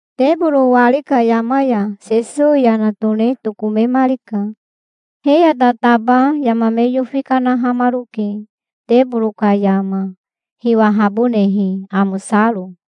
Teboro wari ka yama ya Sesowi yana tone tokomemarika. He ya tataba yama me yofi kanahamaroke, teboro ka yama, hiwahabonehe, amosaro.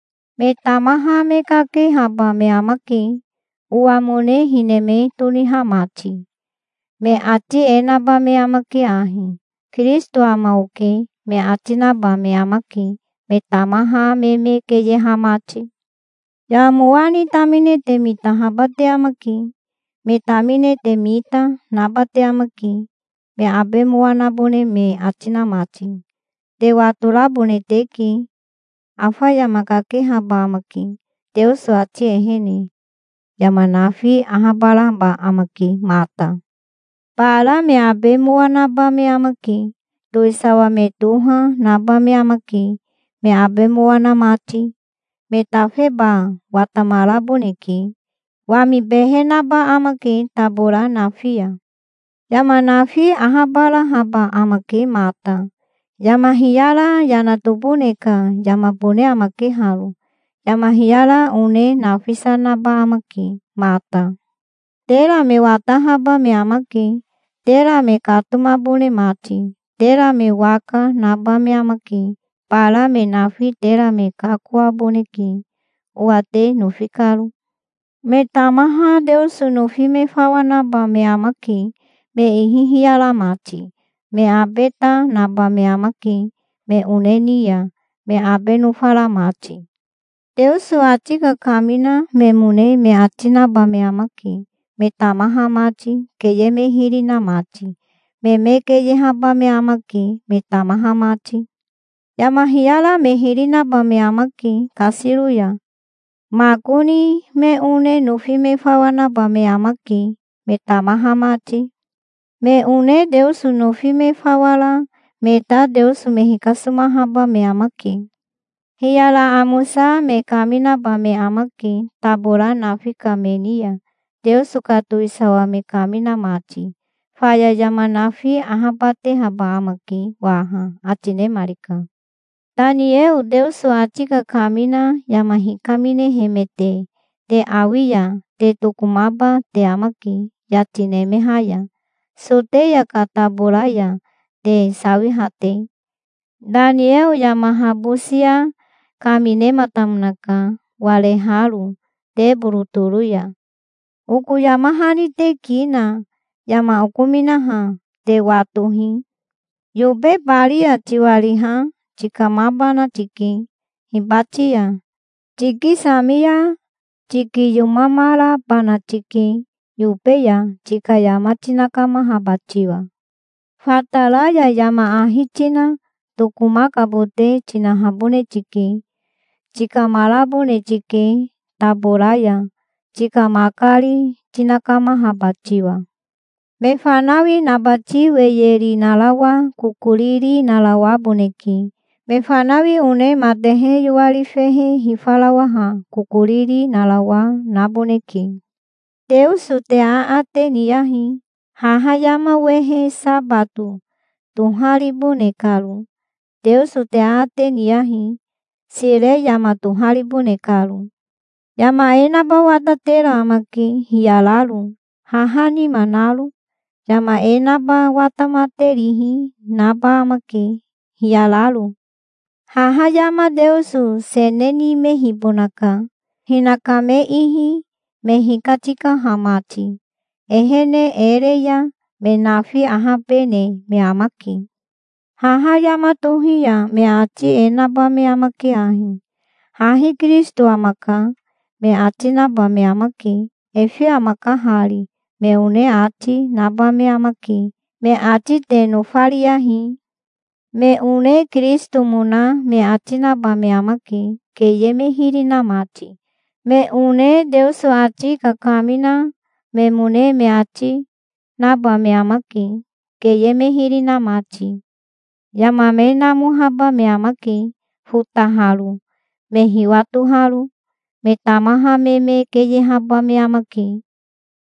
Me tamaha me kakehaba me amake, owamone hine me toniha mati. Me ati e naba me amake ahi: 'Kirisito ama oke', me ati naba me amake, me tamaha me me keyeha mati. Yama mowa ni tamine te mitahaba te amake. Me tamine te mita, naba te amake, me abe mowa nabone me ati na mati. Te watorabone teke. Afa yama kakehaba amake, Teoso ati ehene. Yama nafi ahabaraba amake mata. Bara me abe mowa naba me amake. Towisawa me toha naba me amake, me abe mowa na mati. Me tafeba watamaraboneke. Wami behe naba amake tabora nafi ya. Yama nafi ahabarahaba amake mata. Yama hiyara yana tobone ka yamabone amake haro. Yama hiyara one nafisa naba amake mata". "Tera me watahaba me amake, tera me katomabone mati. Tera me waka naba me amake. Bara me nafi tera me kakoaboneke, owa te nofi karo. Me tamaha Teoso nofi me fawa naba me amake, me ihi hiyara mati. Me abe ta naba me amake me one ni ya, me abe nofara mati". Teoso ati kakamina memone me ati naba me amake, me tamaha mati, keye me hiri na mati. Me me keyehaba me amake, me tamaha mati. Yama hiyara me hiri naba me amake kasiro ya. Makoni me one nofi me fawa naba me amake, me tamaha mati. Me one Teoso nofi me fawa ra me ta Teoso me hikasomahaba me amake. Hiyara amosa me kaminaba me amake tabora nafi ka me ni ya, Teoso ka towisawa me kamina mati. Faya yama nafi ahabatehaba amake waha", ati nemarika. "Tanieo Teoso ati kakamina yama hikaminehemete te awi ya, te tokomaba te amake yati nemeha ya, Soteya ka tabora ya te sawiha te. Tanieo yama habosia kaminematamonaka, wareharo teboro toro ya". (Oko yama hani te ki na yama okominaha te watohi.) "Yobe bari ya tiwariha tikamabana tike hibati ya. Tikisami ya tikiyomamarabana tike yobe ya, tika yama tinakamahaba tiwa. Fatara ya yama ahi tina tokomakabote tinahabone tike. Tikamarabone tike tabora ya, tika makari tinakamahaba tiwa. Me fanawi nabati weyeri narawa kokoriri narawaboneke. Me fanawi one matehe yoari fehe hifarawaha kokoriri narawa naboneke. Teoso te aate niyahi, haha yama wehe sabato toharibone karo. Teoso te aate, niyahi, sire yama toharibone karo. Yama e naba watatera amake, hiyararo, haha nima naro. Yama e naba watamaterihi naba amake, hiyararo. Haha yama Teoso sene nimehibonaka, hinaka me ihi, me hikatikaha mati. Ehene e re ya me nafi ahabene me amake". "Haha yama tohi ya me ati e naba me amake ahi: 'Hahi Kirisito amaka', me ati naba me amake. 'Efe amaka hari', me one ati, naba me amake. Me ati te nofariyahi. Me one Kirisitomona me ati naba me amake, keye me hiri na mati. Me one Teoso ati kakamina memone me ati, naba me amake, keye me hiri na mati. Yama me namohaba me amake, fotaharo, me hiwatoharo. Me tamaha me me keyehaba me amake.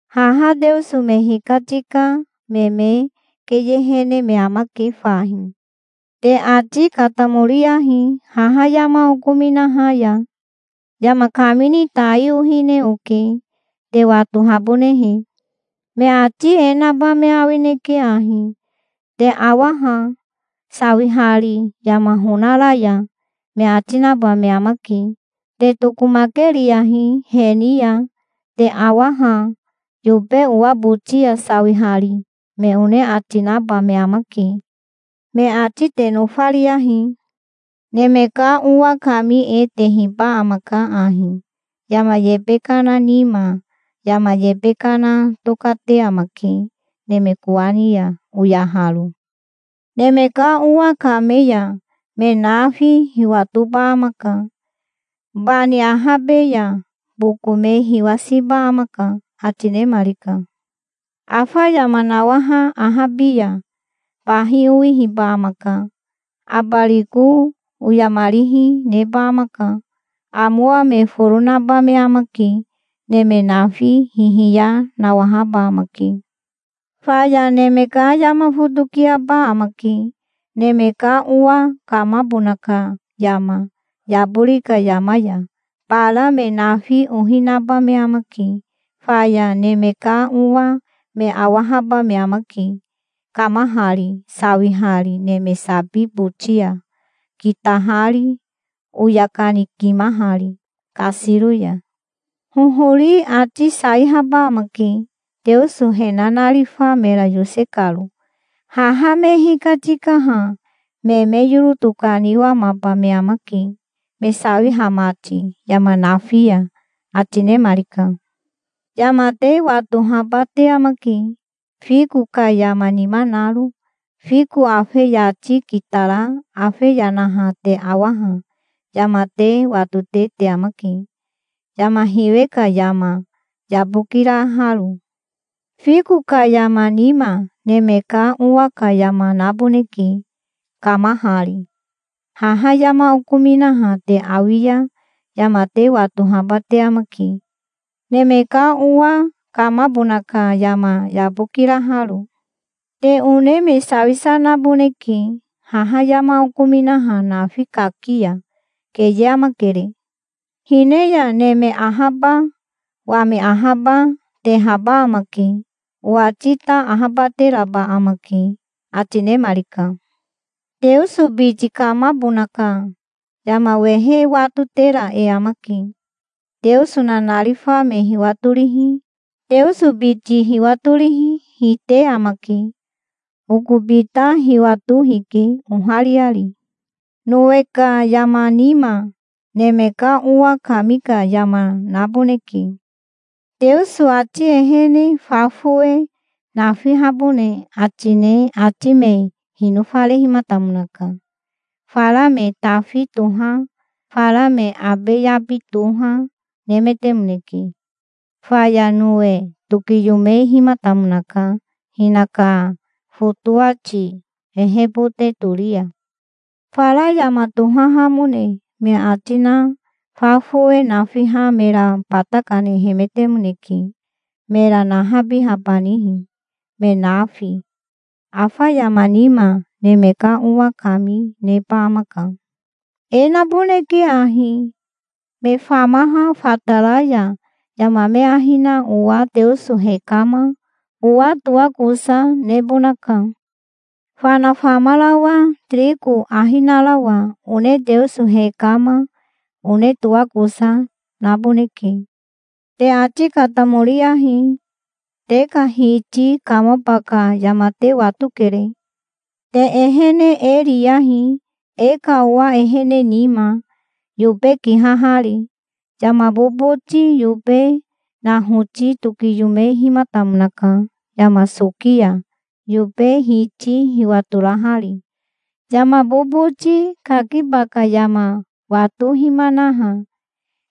Haha Teoso me hikatika me me keyehene me amake fahi. Te ati katamoriyahi, haha yama okominaha ya. Yama kamini tai ohine oke, te watobahabonehe. Me ati e naba me awineke ahi: 'Te awa ha, sawihari yama honara ya', me ati naba me amake. Te tokomakeriyahi he ni ya. 'Te awa ha, yobe owa boti ya sawihari', me one ati, naba me amake. Me ati te nofariyahi". "Neme ka Owa kami e tehiba amaka ahi, yama yebe kana nima. Yama yebe kana tokate amake neme kowani ya, oyaharo. Neme ka Owa kame ya me nafi hiwatoba amaka. Bani ahabe ya boko me hiwasiba amaka", ati nemarika. "Afa yama nawaha ahabi ya bahi owihiba amaka. Abariko oyamarihi neba amaka. Amowa me foro naba me amake. Neme nafi hihiya nawahaba amake. Faya neme ka yama fotokiaba amake, Neme ka Owa kamabona ka yama yabori ka yama ya. Bara me nafi ohi naba me amake. Faya Neme ka Owa me awahaba me amake kamahari, sawihari neme sabi boti ya, kitahari, oya kanikimahari kasiro ya. Hohori ati saihaba amake, Teoso he nanarifa mera yose karo. Haha me hikatikaha me me yoro tokaniwamaba me amake, me sawiha mati yama nafi ya", ati nemarika. "Yama te watohaba te amake, fiko ka yama nima naro. Fiko afe yati kitara afe yanaha te awaha yama te watote te amake, yama hiwe ka yama, yabokiraharo. Fiko ka yama nima Neme ka Owa ka yama naboneke, kamahari. Haha yama okominaha te awi ya yama te watohaba te amake, Neme ka Owa kamabona ka yama, yabokiraharo. Te one me sawisa naboneke haha yama okominaha nafi kaki ya. Keye amakere. Hine ya neme ahaba, wami ahaba, tehaba amake. Owati ta ahabateraba amake", ati nemarika. "Teoso biti kamabona ka yama wehe e watotera e amake. Teoso nanarifa me hiwatorihi, Teoso biti hiwatorihi, hite amake. Okobi ta hiwato hike, ohariari. Nowe ka yama nima Neme ka Owa kami ka yama naboneke. Teoso ati ehene fa fowe nafihabone ati ne ati me hinofarehimatamonaka. Fara me tafi toha, fara me abe yabi toha, nemetemoneke. Faya Nowe tokiyomehimatamonaka hinaka fotowati ehebote tori ya. Fara yama tohahamone me ati na fa fowe nafiha mera bata kanehemetemoneke, mera nahabihabanihi, me nafi. Afa yama nima Neme ka Owa kami neba amaka. E naboneke ahi: Me famaha fatara ya yama me ahi na owa Teoso hekama, owa toakosa, nebonaka. Fana famarawa tiriko ahi narawa one Teoso hekama, one toakosa, naboneke. Te ati katamoriyahi. Te ka Hiti kamaba ka yama te watokere. Te ehene e riyahi, e ka owa ehene nima, yobe kihahari. Yama boboti yobe nahoti tokiyomehimatamonaka yama soki ya, yobe hiti hiwatorahari. Yama boboti kakiba ka yama watohimanaha,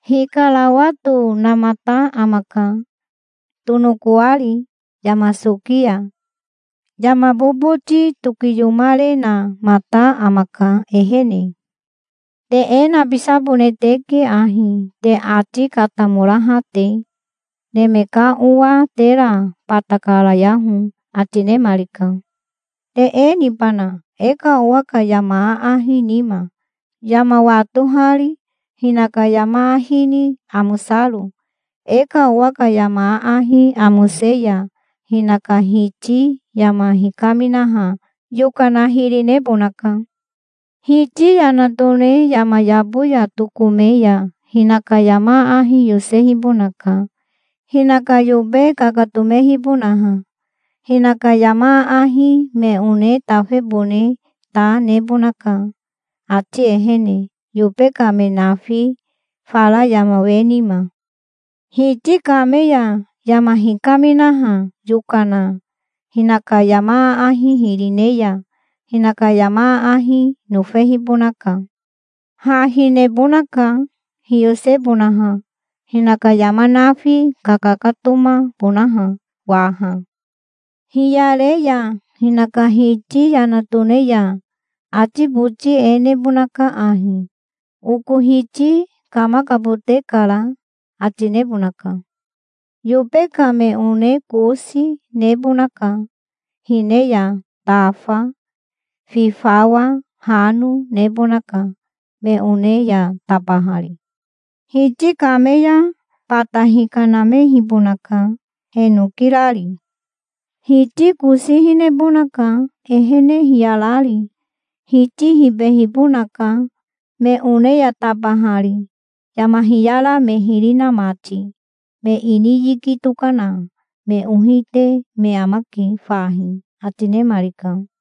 hikarawatonamata amaka, tonokoari, yama soki ya. Yama boboti tokiyomarenamata amaka, ehene. Te e nabisabone teke ahi, te ati katamoraha te. Neme ka Owa tera bata karayaho", ati nemarika. "Te e nibana, e ka owa ka yama aahi nima, yama watohari, hinaka yama ahi ni amosaro? E ka owa ka yama aahi amose ya hinaka hiti yama hikaminaha yokana hiri nebonaka. Hiti yana tone yama yabo ya tokome ya hinaka yama aahi yosehibonaka, hinaka yobe kakatomehibonaha. Hinaka yama aahi me one tafebone ta nebonaka ati ehene, yobe ka me nafi, fara yama we nima. Hiti kame ya yama hikaminaha yokana hinaka yama aahi hiri ne ya, hinaka yama aahi nofehibonaka. Ha hinehibonaka, hiyosebonaha, hinaka yama nafi kakakatomabonaha waha. Hiyare ya hinaka hiti yana tone ya ati boti e nebonaka ahi: 'Oko hiti kamakabote kara', ati nebonaka. Yobe ka me one kosi nebonaka. Hine ya tafa, fi fawa, hano, nebonaka, me one ya tabahari. Hiti kame ya bata hikanamehibonaka, he noki rari. Hiti kosi hinehibonaka, ehene hiyarari. Hiti hibehibonaka, me one ya tabahari, yama hiyara me hiri na mati. Me ini yiki tokana, me ohi, te me amake fahi", ati nemarika.